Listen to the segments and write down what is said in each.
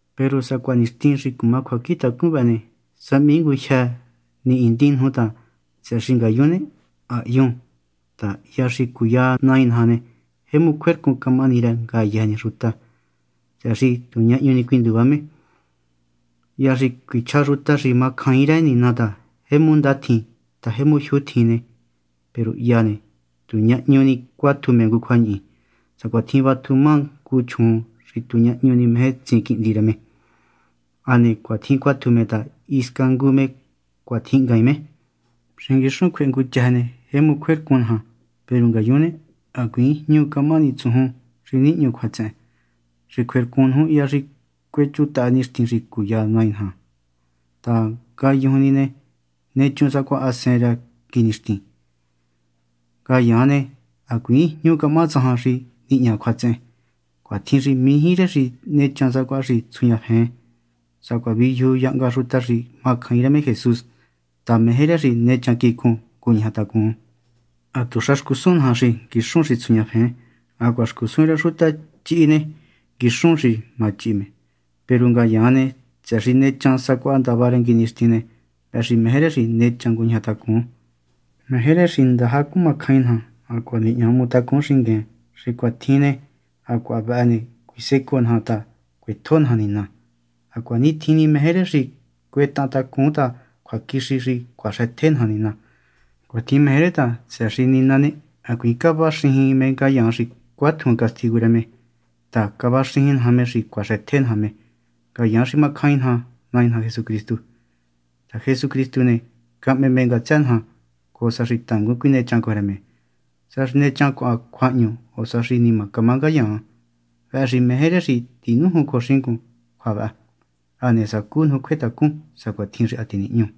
Peru sacuaha nixtin xi cuma cjuacjintacun vëhë ne, sáhmii ngujyë nihindin nuju ta, tsëhë xi ngayun ne, ha hyun ta, hya xi cuya Nai naja ne, jemu cjuercun camahani rë ngayëjë ni xuta, tsëhë xi tu ñahñu ni cuinduva me. Hya xi cuichja xuta xi macjain rë Nina ta: “Jemu ndatjin ta jemu jyuu tjin”, peru hya ne, tu ñahñu ni ne cuatju me ngu cjuañihi, sacuatjin vatju ma ngu chjuun xi tu ñahñu meje tsin quihndi rë me. Hane cuatjin cuatju me ta hisca ngu me cuatjinhngaain me. Xi nguixun cjuehe ngu chëjë ne, jemu cjuercun naja. Peru ngayun ne, hacuiin jñu camaha tsujun xi nihñu cjuatsehen, xi cjuercun nuju hya xi cuechutaha nixtin xi cuya Nai naja ta, ngayujun ni ne, nechun sacuaha hasen rë nguinixtin. Ngayaan ne, hacuiin jñu camaha tsajan xi nihña cjuatsehen. Cuatjin xi mijí rë xi nechan sacuaha xi titsjuñafen, sacuaha viyuju yahnga xuta xi macjain rë me Jesús ta, meje rë xi nechan quicun, nguñajatacun. Hatuxa xcusun naja xi nguixun xi tsjuñafen. Hacuaha xcusun rë xuta chihi ne, nguixun ma chihi me. Peru ngayaan ne, tsëhë xi nechan sacuaha ndavá rë nguinixtin ne, vëhë xi meje rë xi nechan nguñajatacun. Meje rë xi ndaja cumacjain naja hacuaha nihña hmu tacun xingueen. Xi cuatjin nihña ne, hacuaha vëhë ne, cuisecoo naja ta cuetjo naja Nina. Hacuanitjin ni meje rë xi cuetahan tacun ta cjuaquixi xi cuaxëtje naja Nina. Cuatjin meje rë ta, tsëhë xi Nina ne, hacuiin cavaxijin me ngayaan xi cuatjun castigu rë me ta, cavaxijin naja me xi cuaxëtje naja me, ngayaan xi macjain naja Nai naja Jesucristu ta, Jesucristu ne, cahme me ngatsë naja, cojo sa xi tangun cuinechan cojo rë me, sa xi nechancuaan cjuahñu o sa xi nima camá ngayaan. Vëhë xi meje rë xi tinújun cojo xingun cjua vëhë, hane sacu nuju cjuetacun, sacuatjin xi ha tinihñú.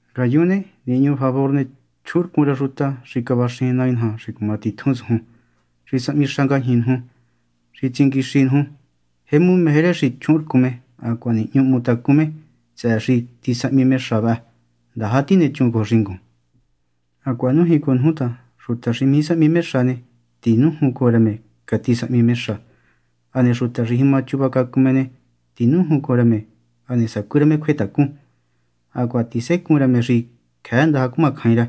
Ngayun ne, nihñu favor ne, chjuhunrcun rë xuta xi cavaxijin Nai naja xi cuma titjun tsujun, xi sahmi xa ngajñi nuju, xi tsinguixi nuju. Jemu meje rë xi chjuhunrcun me hacuaha nihñu hmu tacun me tsëhë xi tisahmi me xa vëhë. Ndaja tinechun cojo xingun. Hacuaha nújin cojo nuju ta xuta xi mijí sahmi xa ne, tinújun cojo rë me catisahmi me xa. Hane xuta xi jima chuvacacun ne, tinújun cojo rë me, hane sacú rë me cjuetacun. Hacuaha tisecuun rë me xi cjëë ndaja cumacjain rë.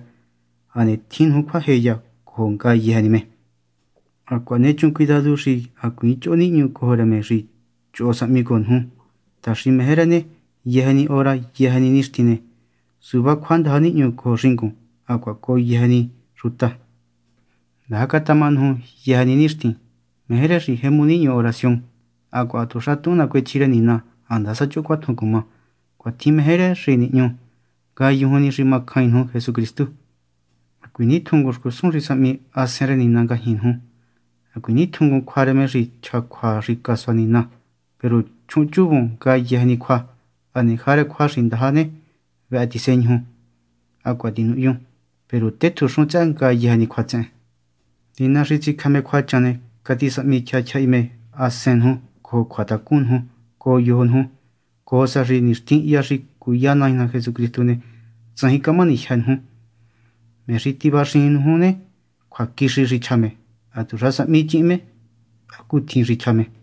Hane tjin nuju cjuajeya cojo ngayëjë ni me. Hacuaha nechun cuidadu xi hacuiin choho nihñu cojo rë me xi choho sahmi cojo nuju ta, xi meje rë ne, yëjë ni hora yëjë ni nixtin ne, suvá cjuandaja nihñu cojo xingun hacuaha cojo yëjë ni xuta. Ndaja catama nuju yëjë ni nixtin. Meje rë xi jemu nihñu oración. Hacuaha hatuxa tuhun nacuechji rë Nina, handasa choho cuatjun cuma. Cuatjin meje rë Nina xi nihñu, ngayujun ni xi macjain nuju Jesucristu. Hacuiin nitjunngun xcusun xi sahmi Hasen rë Nina ngajñi nuju. Hacuiin nitjunngun cjua rë me xi chja cjua xi casua Nina. Peru chjuhunchuvun ngayëjë ni cjua. Hane jarë cjua xi ndaja ne, vëhë tiseñuju hacuaha tinuhyun. Peru tétjunxun tsëhë ngayëjë ni cjuatsehen. Nina xi tsicjë me cjuachan ne, catisahmi tyjahi tyjahi me hasen nuju cojo cjuatacun nuju cojo yojo nuju, cojo sa xi nixtin hya xi cuya Nai naja Jesucristu ne, tsajin camahani jyë́ nuju. Me xi tivaxijin nuju ne, cjuaquixi xi chja me. Hatuxa sahmichihin me hacutjin xi chja me.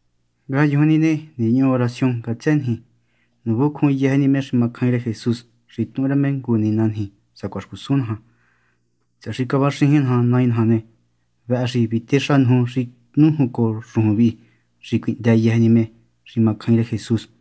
Ngayun ne, nihñu oración ngatsë niji. Nuvuncjun yëjë ni me xi macjain rë Jesús xi tuhun rë me ngu nina niji, sacuaha xcusun naja. Tsëhë xi cavaxijin ná Nai naja ne, vëhë xi vitéxa nuju xi nújun cojo xujun vi xi cuihndë yëjë ni me xi macjain rë Jesús.